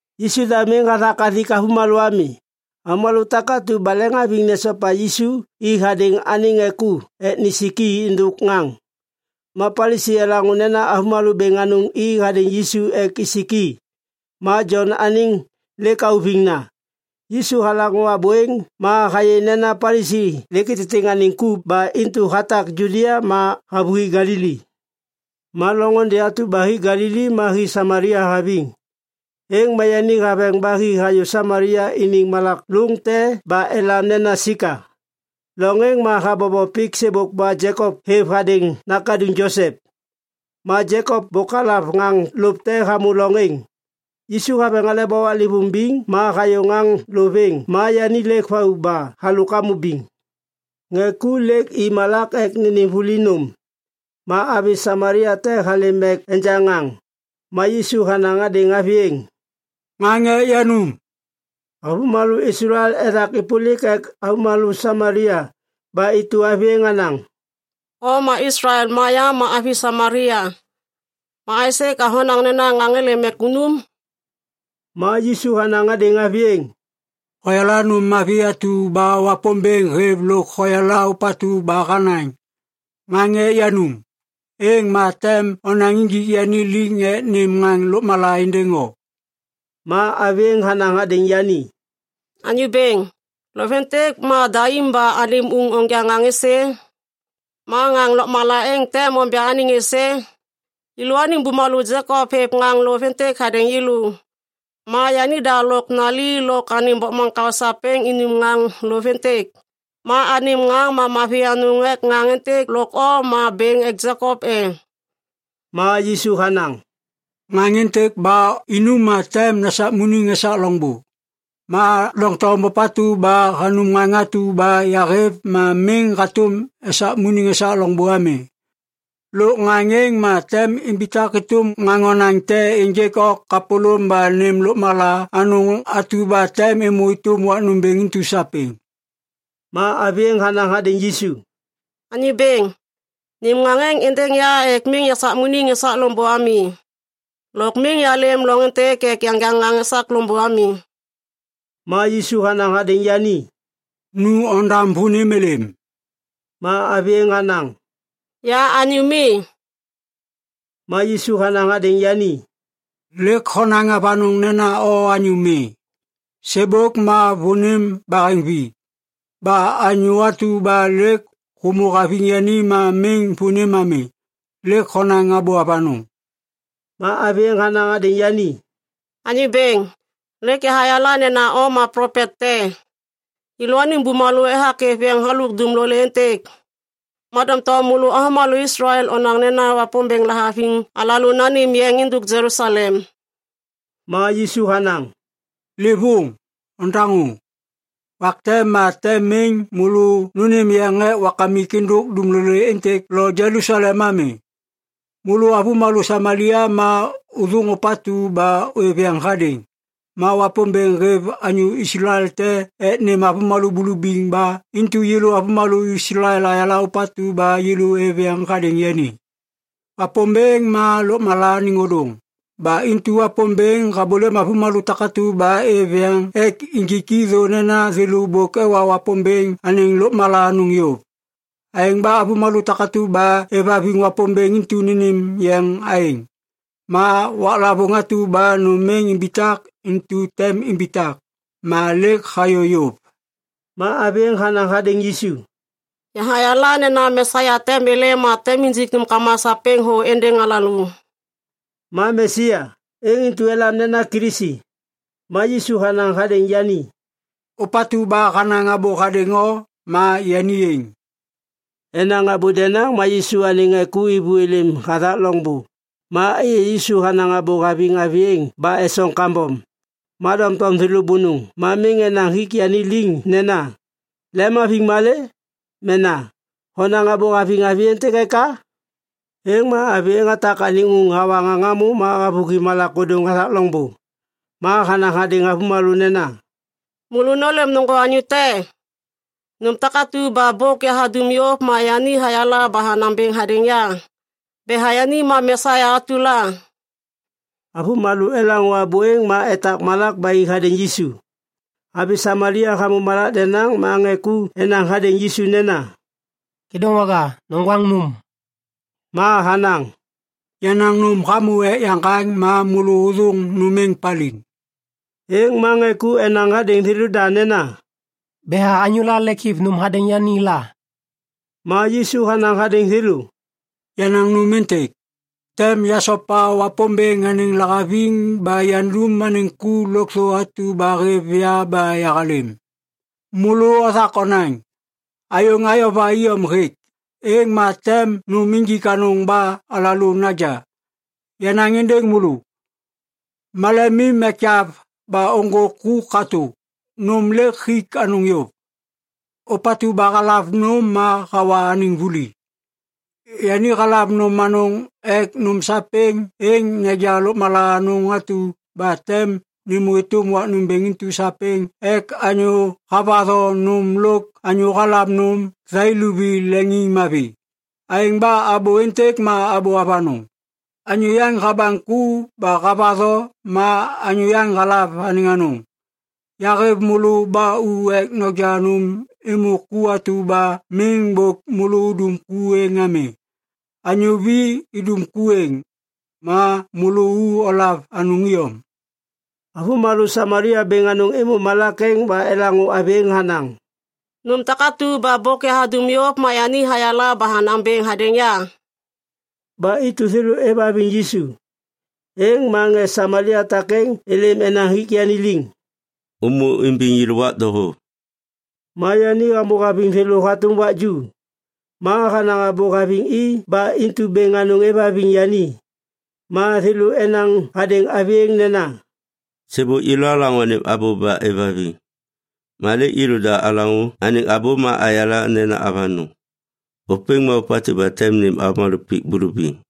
Yisu da miŋ hathak hathik avômalô ami. Avômalô takatu ba leŋiŋhaviŋ nesopa Yisu i hadêŋ anêŋ ŋê ku ek nisik i êndôk ŋaŋ. Ma Palisi elaŋô nena avômalô bêŋ anôŋ i hadêŋ Yisu ek isik i. Ma Jon anêŋ lêk auviŋna. Yisu halaŋô abô êŋ ma hayê nena Palisi lêk ititiŋ anêŋ ku ba intu hatak Judia ma havôhi Galili. Ma loŋôndê atu ba hi Galili ma hi Samalia haviŋ. Êŋ ma yani haveŋ ba hi hayô Samalia iniŋ malak lôŋ te ba elam nena Sika. Loŋ êŋ ma habobo pik sêbôk ba Jekop hêv hadêŋ nakaduŋ Josep. Ma Jekop bôk halav ŋaŋ lôv te hamô loŋ êŋ. Yisu haveŋ aleba waklêvôŋ biŋ ma hayô ŋaŋ lôv êŋ ma yani lêk vau ba halôk hamô biŋ. Ŋê ku lêk i malak ek nênêm vuli nôm. Ma avi Samalia te halêm ek enja ŋaŋ. Ma Yisu hanaŋ hadêŋ avi êŋ, “Ŋaŋ ek yanum.” Avômalô Islael ethak êpôlik ek avômalô Samalia ba intu avi êŋ hanaŋ, “O ma Islael ma ya ma avi Samalia. Ma aisê ka honaŋ nena ŋaŋ êlêm ek unum?” Ma Yisu hanaŋ hadêŋ avi êŋ, “Hoyala nôm mavi atu ba Wapômbêŋ hêv lôk hoyala ôpatu ba hanaŋ, ‘Ŋaŋ ek yanum’, êŋ ma tem onaŋ injik yani liŋ ek nêm ŋaŋ lôkmala êndêŋ o.” Ma avi êŋ hanaŋ hadêŋ yani, “Anyô Bêŋ, lôv êntêk ma daim ba anêm uŋ onja ŋaŋ êsê? Ma ŋaŋ lôkmala êŋ tem onja anêŋ êsê? Yêlôaniŋ bumalô Jekop hêv ŋaŋ lôv êntêk hadêŋ yêlô. Ma yanida lôk nali lôk anêŋ bokmaŋkao sapêŋ inum halôk ŋaŋ lôv êntêk. Ma anêm ŋaŋ ma mavi anôŋ ek ŋaŋ êntêk lôk o ma bêŋ ek Jekop e?” Ma Yisu hanaŋ, “Ŋaŋ êntêk ba inum ma tem nesakmuniŋ esak loŋbô. Ma doŋtom ôpatu ba hanum ŋaŋ atu ba yahêv ma miŋ hatôm esakmuniŋ esak loŋbô ami. Lôk ŋaŋ êŋ ma tem imbitak êtôm ŋaŋ onaŋ te ênjêk o kapôlôm ba nêm lôkmala anôŋ atu ba tem êmô êtôm wak nômbêŋ intu sapêŋ.” Ma avi êŋ hanaŋ hadêŋ Yisu, “Anyô bêŋ, nêm ŋaŋ êŋ êndêŋ ya ek miŋ yasakmuniŋ esak loŋbô ami. Lôk miŋ yalêm loŋ êntêk ek yanja ŋaŋ esak loŋbô ami.” Ma Yisu hanaŋ hadêŋ yani, “Nu ondam vônim êlêm.” Ma avi êŋ hanaŋ, “Ya anyô mi.” Ma Yisu hanaŋ hadêŋ yani, “Lêk honaŋ avanôŋ nena o anyô mi. Sêbôk ma vônim baheŋvi. Ba anyô atu ba lêk hômô haviŋ yani ma miŋ vônim ami. Lêk honaŋ abô avanôŋ!” Ma avi êŋ hanaŋ hadêŋ yani, “Anyô bêŋ, lêk yahayala nena o ma plopet te. Yêlôaniŋ bumalô ethak êv yeŋ halôk dumlolê êntêk. Ma doŋtom môlô avômalô Islael onaŋ nena Wapômbêŋ lahaviŋ alalô nanêm yeŋ êndôk Jelusalem.” Ma Yisu hanaŋ, “Livôŋ! Ondaŋô! Wak te ma tem miŋ môlô nônêm yeŋ ek Wakamik êndôk dumlolê êntêk lo Jelusalem ami. Môlô avômalô Samalia ma ôthôŋ ôpatu ba ôêv yeŋ hadêŋ. Ma Wapômbêŋ hêv anyô Islael te ek nêm avômalô bulubiŋ ba intu yêlô avômalô Islael ayala ôpatu ba yêlô êv yeŋ hadêŋ yani. “Wapômbêŋ ma lôkmala anêŋ ôdôŋ. Ba intu Wapômbêŋ habôlêm avômalô takatu ba êv yeŋ ek injiki thô nena thêlô bôk ewa Wapômbêŋ anêŋ lôkmala anôŋ yôv. Aêŋ ba avômalô takatu ba êvhaviŋ Wapômbêŋ intu nênêm yeŋ aêŋ. Ma waklavôŋ atu ba nôm êŋ imbitak intu tem imbitak. Ma lêk hayô yôv.” Ma avi êŋ hanaŋ hadêŋ Yisu, “Yahayala nena Mesia tem êlêm ma tem injik nômkama sapêŋ thô êndêŋ alalô.” (Ma “Mesia” êŋ intu elam nena “Kilisi”.) Ma Yisu hanaŋ hadêŋ yani, “Ôpatu ba hanaŋ abô hadêŋ o ma yani êŋ.” Enaŋ abô denaŋ ma Yisu anêŋ ŋê ku êvô êlêm hathak loŋbô ma êyê Yisu hanaŋ abô haviŋ avi êŋ ba esoŋ kambom. Ma doŋtom thêlô bônôŋ ma miŋ enaŋ hik yani liŋ nena, “Lemhaviŋ malê?” mena “Honaŋ abô haviŋ avi êntêk eka?” Êŋ ma avi êŋ hatak anêŋ uŋ hawa ŋaŋ hamô ma havôhi malak ôdôŋ hathak loŋbô. Ma hanaŋ hadêŋ avômalô nena, “Môlô nôlêm ôŋgô anyô te! Nôm takatu ba bôk yahadum yôv ma yani hayala ba hanaŋ bêŋ hadêŋ ya. Betha yani ma Mesia atu la.” Avômalô elaŋô abô êŋ ma etak malak ba i hadêŋ Yisu. Avi Samalia hamô malak denaŋ ma ŋê ku enaŋ hadêŋ Yisu nena, “Kêdôŋwaga, noŋgwaŋ nôm.” Ma hanaŋ, “Yenaŋ nôm hamô ek yaŋgaŋ ma môlô ôthôŋ nôm êŋ paliŋ.” Êŋ ma ŋê ku enaŋ hadêŋ thêlôda nena, “Betha anyôla lêk hêv nôm hadêŋ yani la?” Ma Yisu hanaŋ hadêŋ thêlô, “Yenaŋ nôm êntêk. Tem yasopa Wapômbêŋ anêŋ lahaviŋ ba yandum anêŋ ku lôkthô atu ba hêv ya ba yahalêm. Môlô othak onaŋ, ‘Ayôŋ ayova iyom hêk, êŋ ma tem nôm injik anôŋ ba alalô naja.’ Yanaŋ êndêŋ môlô! Malemim ekyav ba ôŋgô ku katô! Nôm lêk hik anôŋ yôv! Ôpatu ba halav nôm ma hawa anêŋ vuli. Yani halav nôm anôŋ ek nôm sapêŋ êŋ neja lôkmala anôŋ atu ba tem nêmô êtôm wak nômbêŋ intu sapêŋ ek anyô havatho nôm lôk anyô halav nôm thai luvi leŋiŋmavi. Aêŋ ba abô êntêk ma abô avanôŋ. ‘Anyô yaŋ habaŋ ku ba havatho ma anyô yaŋ halav anêŋ anôŋ.’ Yahêv môlô ba u ek noja nôm êmô ku atu ba miŋ bôk môlô udum ku êŋ ami. Anyô vi idum ku êŋ. Ma môlô u olav anôŋ iyom.” Avômalô Samalia bêŋ anôŋ êmô malak êŋ ba elaŋô avi êŋ hanaŋ, “Nôm takatu ba bôk yahadum yôv ma yani hayala ba hanaŋ bêŋ hadêŋ ya!” Ba intu thêlô êvhaviŋ Yisu. Êŋ ma ŋê Samalia takêŋ êlêm enaŋ hik yani liŋ, “Ômô imbiŋ yêlô wak doho!” Ma yani hamô haviŋ thêlô hatôm wak ju. Ma hanaŋ abô haviŋ i ba intu bêŋ anôŋ êvhaviŋ yani. Ma thêlô enaŋ hadêŋ avi êŋ nena, “Sêbôk yêlô alaŋô anêm abô ba êvhaviŋ. Ma lêk yêlôda alaŋô anêŋ abô ma ayala nena avanôŋ. Ôpêŋ ma ôpatu ba tem nêm avômalô pik bulubiŋ.”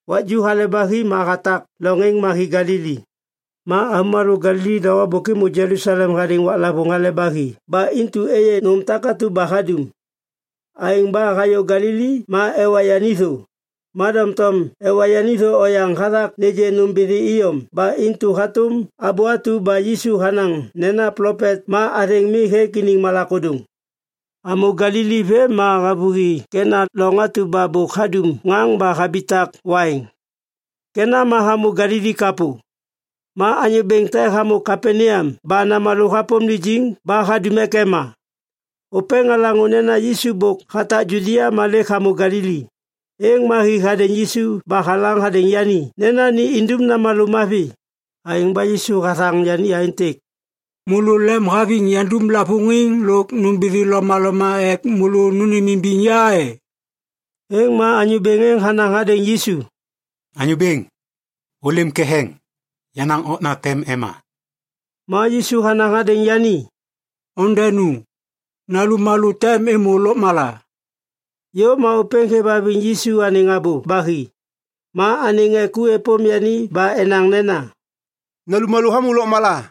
Wak ju hale ba hi ma hatak loŋ êŋ ma hi Galili. Ma avômalô Galili doho bôk êmô Jelusalem hadêŋ waklavôŋ Hale ba Hi ba intu êyê nôm takatu ba hadum. Aêŋ ba hayô Galili ma ewa yani thô. Ma doŋtom ewa yani thô oyaŋ hathak nêgê nômbithi iyom ba intu hatôm abô atu ba Yisu hanaŋ nena plopet ma athêŋ mi hêk iniŋ malak ôdôŋ. Hamô Galili vêm ma havôhi Kena loŋ atu ba bôk hadum ŋaŋ ba habitak waiŋ. Kena ma hamô Galili kapô. Ma anyô bêŋ te hamô Kapaneam ba namalô hapôm lijiŋ ba hadum ek ema. Ôpêŋ halaŋô nena Yisu bôk hatak Judia ma lêk hamô Galili. Êŋ ma hi hadêŋ Yisu ba halaŋ hadêŋ yani nena ni indum namalô mavi. Aêŋ ba Yisu hathaŋ yani aêntêk, “Môlô lemhaviŋ yandum lavôŋiŋ lôk nômbithi lomaloma ek môlô nônêmimbiŋ ya e?” Êŋ ma anyô bêŋ êŋ hanaŋ hadêŋ Yisu, “Anyô bêŋ, ôlêm ketheŋ! Yenaŋ okna tem ema!” Ma Yisu hanaŋ hadêŋ yani, “Ondenu! Nalummalô tem êmô lôkmala.” Yôv ma ôpêŋ hêvhaviŋ Yisu anêŋ abô ba hi ma anêŋ ŋê ku êpôm yani ba enaŋ nena, “Nalummalô hamô lôkmala.”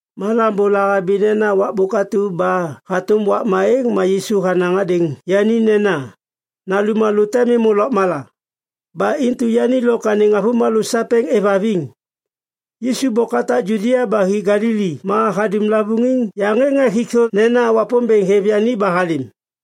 Ma lambô lahabi nena wakbôk atu ba hatôm wakma êŋ ma Yisu hanaŋ hadêŋ yani nena, “Nalummalô tem êmô lôkmala.” Ba intu yani lôk anêŋ avômalô sapêŋ êvhaviŋ. Yisu bôk hatak Judia ba hi Galili ma hadum lavôŋiŋ yaŋ êŋ ek hik thô nena Wapômbêŋ hêv yani ba halêm.